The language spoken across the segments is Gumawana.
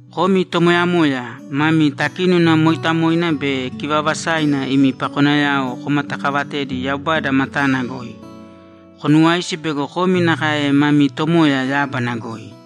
Komi tomoyamoya, mami takínona mooitamoina be kivaavasaina imi pakonayao komatakaavatēdi Yaubada matana goi. Konuwāisi bego komi nakae mami Tomoya yábana goi.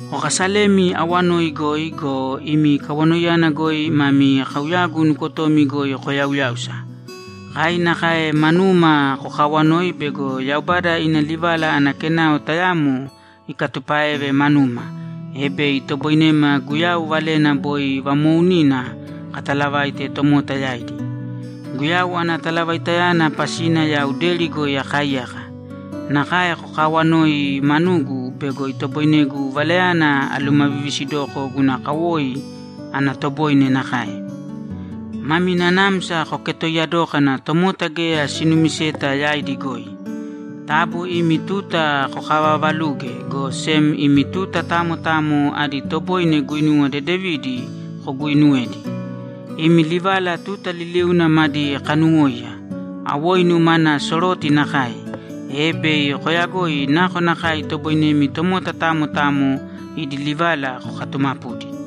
Kokaasalēmi awanoi goi go, imi kawanoiyana goi mami kauyagu nukotomi goi koyauyāusa. Kai nakae manuma kokaawanōi bego Yaubada ina livala ana kenao tayamo ikatupáeve manuma, e bei itoboinema Guyau valena boi vamoounina katalavaite tomota yaidi. Guyau ana talavaitayana pasina yau deri goi akaaiyaka. Nakae kokaawanōi manugu bego itoboinegu valayana alumavivisidoko guna kawoi ana toboine nakae. Mami nanamsa koketooiya dōkana tomota geya sinumiseta yaidi goi. Taabu imi tuta kokavaavalūge, go sem imi tuta tamo tamo adi toboine guinuwa dedevidi koguuinuwēdi. Imi livala tuta liliuna madi kaanuwōiya, awoinu mana soroti nakae, e bei koyagoi nakonakae itoboinemi tomota tamo tamo idi livala kokatumapudi.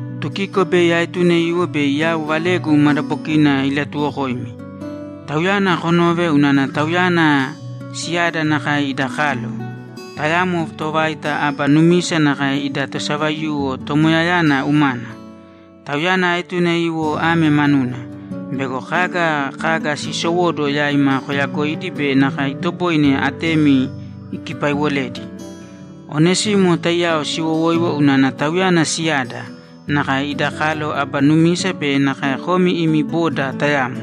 Tukiko bei aetune iwo bei yau valegu madabokina ilatuwokoimi. Tauyana konōve unana tauyana siyada nakae ida kalo, tayamo tovaita aba numisa nakae ida tosavaiyuwo Tomoyayana umana. Tauyana aetune iwo ame manuna: Bego kaga kaga siisowóduwo yaima koyagoidi be nakae itoboine atemi ikipaiwoledi. Onesimo taiyao siwowoiwo unana tauyana siyada, nakae ida kalo aba numisa be nakae komi imi boda tayamo.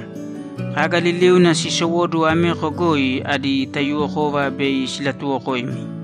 Kaga liliuna siisowóduwo ameko goi adi taiyuwokova bei silatuwokoimi.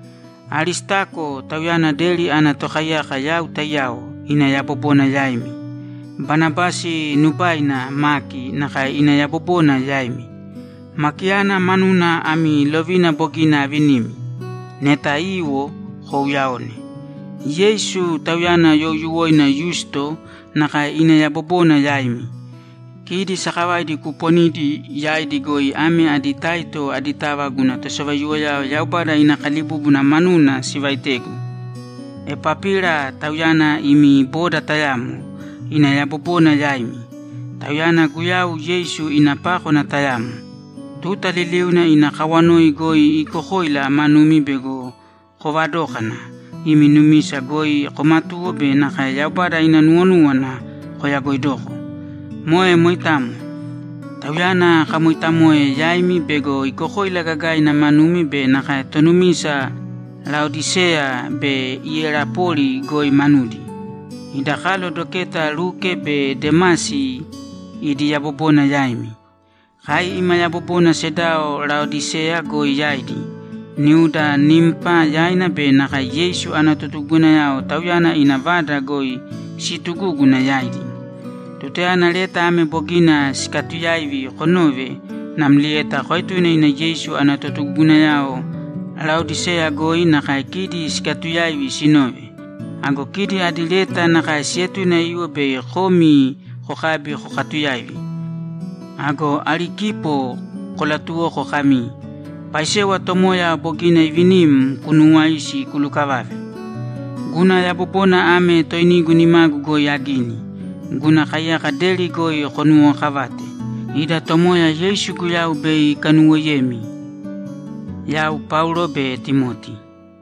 Aristako, tauyana deri ana tokaiyako yau taiyao, ina yabobona yaimi. Banabasi nubaina Maki nakae ina yabobona yaimi. Makiyana manuna ami lovina bogina avinimi. Neta iwo, kouyaōne. Yeisu, tauyana youyuwoina Yusto, nakae ina yabobona yaimi. Kidi sakavaidi kuuponidi yaidi goi ame adi taito aditava guna tosavaiyuwoyao Yaubada ina kalibúbuna manuna sivaitegu. Epapira, tauyana imi boda tayamo, ina yabobona yaimi. Tauyana Guyau Yeisu ina pákwana tayamo. Tuta liliuna ina kawanoi goi iikokoila manumi bego koovadókana, imi numisa goi komatuwo be nakae Yaubada ina nuwonúwana koyagoidoko. Moe moitamo. Tauyana akamoitamoe yaimi bego iikokoila gagaina manumi be nakae tonumisa Laodiseya be Iyerapoli goi manudi. Ida kalo doketa Luke be Demasi idi yabobona yaimi. Kai ima yabobona sedao Laodiseya goi yaidi, niuda Nimpa yaina be nakae Yeisu ana totugugunayao tauyana ina vada goi siitugúguna yaidi. Tutayana leta ame bogina sikatuyaivi konove, namlieta koetūne ina Yeisu ana totugugunayao Laodiseya goi nakae kidi sikatuyaivi sinove. Ago kidi adi leta nakae sietune iwo bei komi kokabi kokatuyaivi. Ago Arikipo kolatuwōko kami, ‘Paisewa Tomoya bogina iivinim kunuwāisi kulukavave.’ Guna yabobona ame toinigu nimagu goi agini. Guna kaiyaka deri goi konuwokavāte. Ida Tomoya Yeisu Guyau bei ikanuwoiyemi! Yau Paulo be Timoti